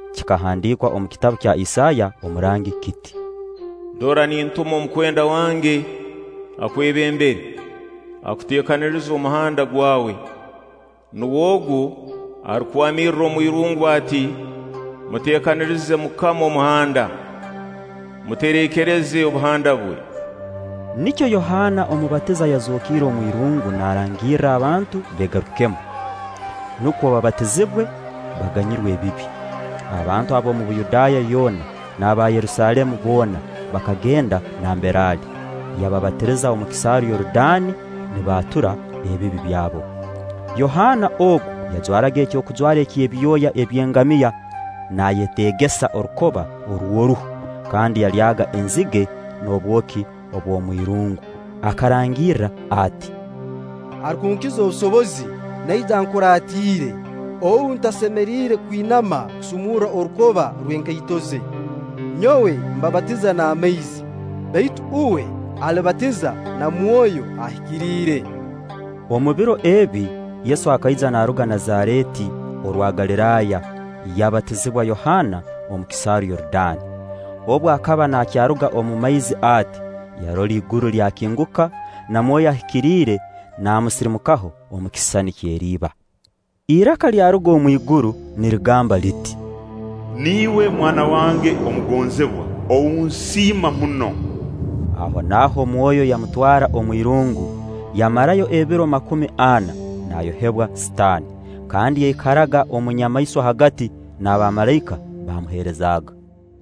Kikahandiikwa omu kitabu kya Isaaya omurangi kiti: “Dora, nintuma omukwenda wange akwebembere, akuteekanirize omuhanda gwawe; nuwe ogu arukwamirra omwirungu ati: Muteekanirize MUKAMA omuhanda, mutereekereze obuhanda bwe.” Nikyo Yohaana Omubatiza yazookiire omwirungu naarangirra abantu beegarukemu, nukwo babatizibwe, baganyirwe ebibi. Abantu ab'omu Buyudaaya yoona n'aba Yerusaalemu boona bakagenda nambere ali, yababatiriza omu kisaaru Yorudaani, nibaatura ebibi byabo. Yohaana ogu yajwaraga ekyokujwara ky'ebyoya by'engamiya, naayeteegesa orukoba rw'oruhu, kandi yalyaga enzige n'obwoki obw'omwirungu. Akarangirra ati: “Arukunkiza obusobozi naija ankuratiire, ou ntasemeriire kwinama kusumurra orukoba rw'enkaito ze. Nyowe mbabatiza n'amaizi; baitu uwe alibabatiza na Mwoyo Ahikiriire.” Omu biro ebi, Yesu akaija naaruga Nazareeti orwa Galiraaya yabatizibwa Yohaana omu kisaaru Yorudaani. Obu akaba nakyaruga omu maizi ati, yarora iguru lyakinguka, na Mwoyo Ahikiriire naamusirimukaho omu kisisani ky'eriiba; iraka lyaruga omwiguru nirigamba liti: “Niiwe Mwana wange omugonzibwa, ou nsiima muno.” Ahonaaho Mwoyo yamutwara omu irungu. Yamarayo ebiro makumi ana, naayohebwa Sitaani; kandi yaikaraga omu nyamaiswa hagati; n'abamalaika baamuheerezaaga.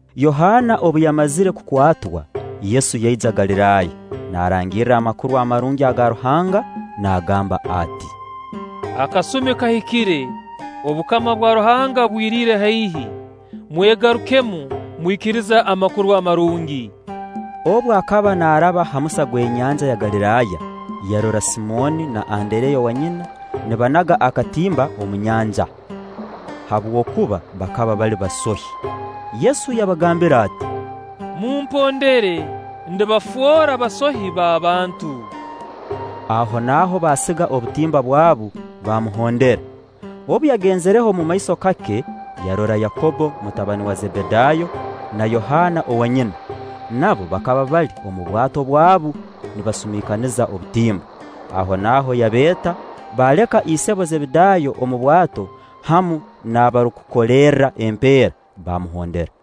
Yohaana obu yamazire kukwatwa, Yesu yaija Galiraaya, naarangirra Amakuru Amarungi aga Ruhanga, naagamba ati: “Akasumi kahikire, obukama bwa Ruhanga bwiriire haihi; mwegarukemu, mwikirize Amakuru Amarungi.” Obu akaba naaraba ha musa gw'enyanja ya Galiraaya, yarora Simooni na Andereya owanyina nibanaga akatimba omu nyanja; habwokuba bakaba bali basohi. Yesu yabagambira ati: “Mumpondere, ndibafoora basohi b'abantu.” Ahonaaho baasiga obutimba bwabu, baamuhondera. Obu yagenzireho omumaiso kake, yarora Yakobbo mutabani wa Zebedaayo, na Yohaana owanyina, nabo bakaba bali omu bwato bwabu nibasumiikaniza obutimba. Ahonaaho yabeeta; baaleka isebo Zebedaayo omu bwato hamu n'abarukukolerra empeera, baamuhondera.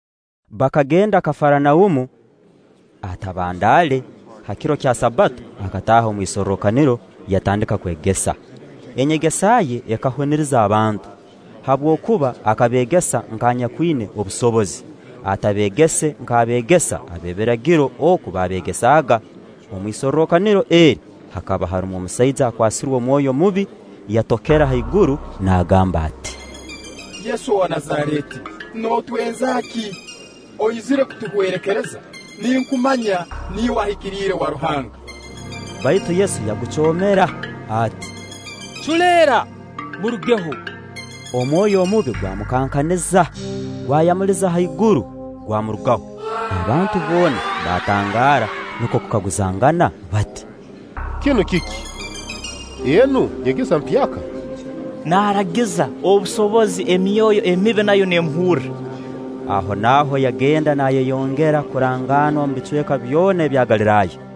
Bakagenda Kafaranaumu; atabandaale, ha kiro kya Sabbato akataaha omu isorrokaniro, yatandika kwegesa. Enyegesa ye ekahuniriza abantu, habwokuba akabeegesa nk'anyakwina obusobozi, atabeegese nk'abeegesa b'ebiragiro oku baabeegesaaga. Omu isorrokaniro eri hakaba harumu omusaija akwasirwe omwoyo mubi: Yatokera haiguru naagamba ati: “Yesu owa Nazareeti nootwenza ki? Oizire kutuhwerekereza? Ninkumanya, niiwe ahikiriire wa Ruhanga.” Baitu Yesu yagucoomera ati: “Culeera, murugeho!” Omwoyo omubi gwamukankaniza, gwayamuliza haiguru, gwamurugaho. Abantu boona baatangaara, nukwo kukaguzangana bati: “Kinu kiki? Enu nyegesa mpyaka! Naaragiza obusobozi emyoyo emibi, nayo neemuhurra.” Ahonaaho yagenda naayeyongera kurangaanwa omu bicweka byona ebya Galiraaya.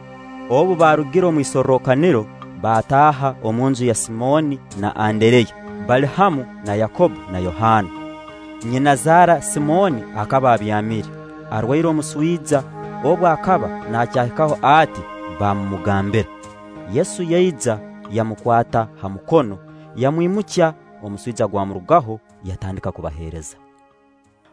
Obu baarugire omu isorrokaniro, baataaha omu nju ya Simooni na Andereya, bali hamu na Yakobbo na Yohaana. Nyinazaara Simooni akaba abyamire, arwaire omuswija obu akaba naakyahikaho ati, baamumugambira. Yesu yaija, yamukwata ha mukono, yamwimukya; omuswija gwamurugaho; yatandika kubaheereza.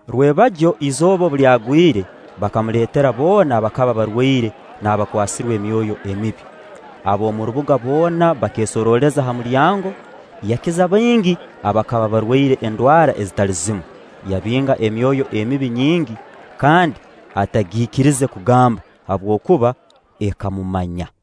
Rwebagyo, izooba obu lyagwire, bakamuleetera boona abakaba barwaire n'abakwasirwe emyoyo emibi. Ab'omu rubuga boona bakeesorooleza ha mulyango. Yakiza baingi abakaba barwaire endwara ezitali zimu; yabinga emyoyo emibi nyingi, kandi atagiikirize kugamba, habwokuba ekamumanya.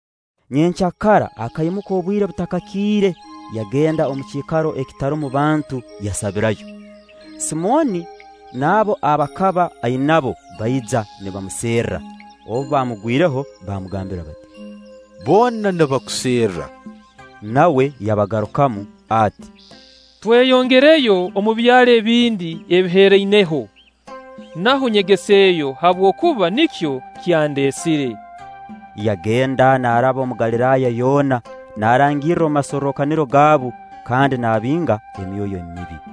Nyenkya akaimuka obwire butakakiire, yagenda omu kiikaro ekitarumu bantu, yasabirayo. Simooni n'abo aba akaba ainabo baija nibamuserra, obu baamugwireho baamugambira bati: “Boona nibakuserra.” Nawe yabagarukamu ati: “Tweyongereyo omu byaro ebindi ebiherraineho, naho nyegeseeyo; habwokuba nikyo kyandeesire.” Yagenda naaraba omu Galiraaya yoona, naarangirra omu masorrokaniro gaabu, kandi naabinga emyoyo emibi.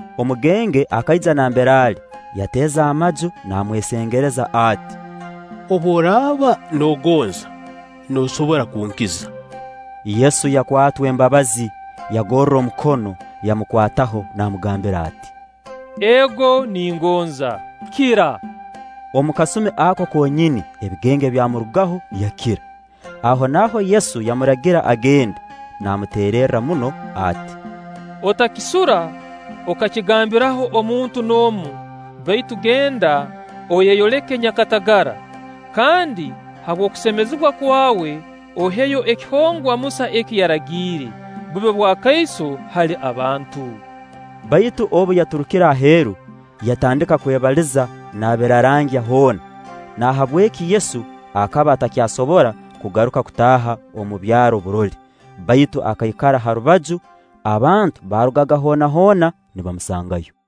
Omugenge akaija nambere ali, yateeza amaju naamwesengereza ati: “Obu oraaba noogonza, noosobora kunkiza.” Yesu yakwatwa embabazi, yagorra omukono, yamukwataho, namugambira ati: “Ego ningonza; kira.” Omu kasumi ako konyini ebigenge byamurugaho, yakira. Ahonaaho Yesu yamuragira agende, naamuteererra muno ati: “Otakisura okakigambiraho omuntu n'omu, baitu genda oyeyoleke nyakatagara, kandi habw'okusemezibwa kwawe oheyo ekihongwa Musa eki yaragiire, bube bwakaiso hali abantu.” Baitu obu yaturukire aheeru, yatandika kwebaliza naabirarangya hoona; nahabweki Yesu akaba atakyasobora kugaruka kutaaha omu byaro burole, baitu akaikara ha rubaju; abantu baarugaga hoona hoona, nibamusangayo.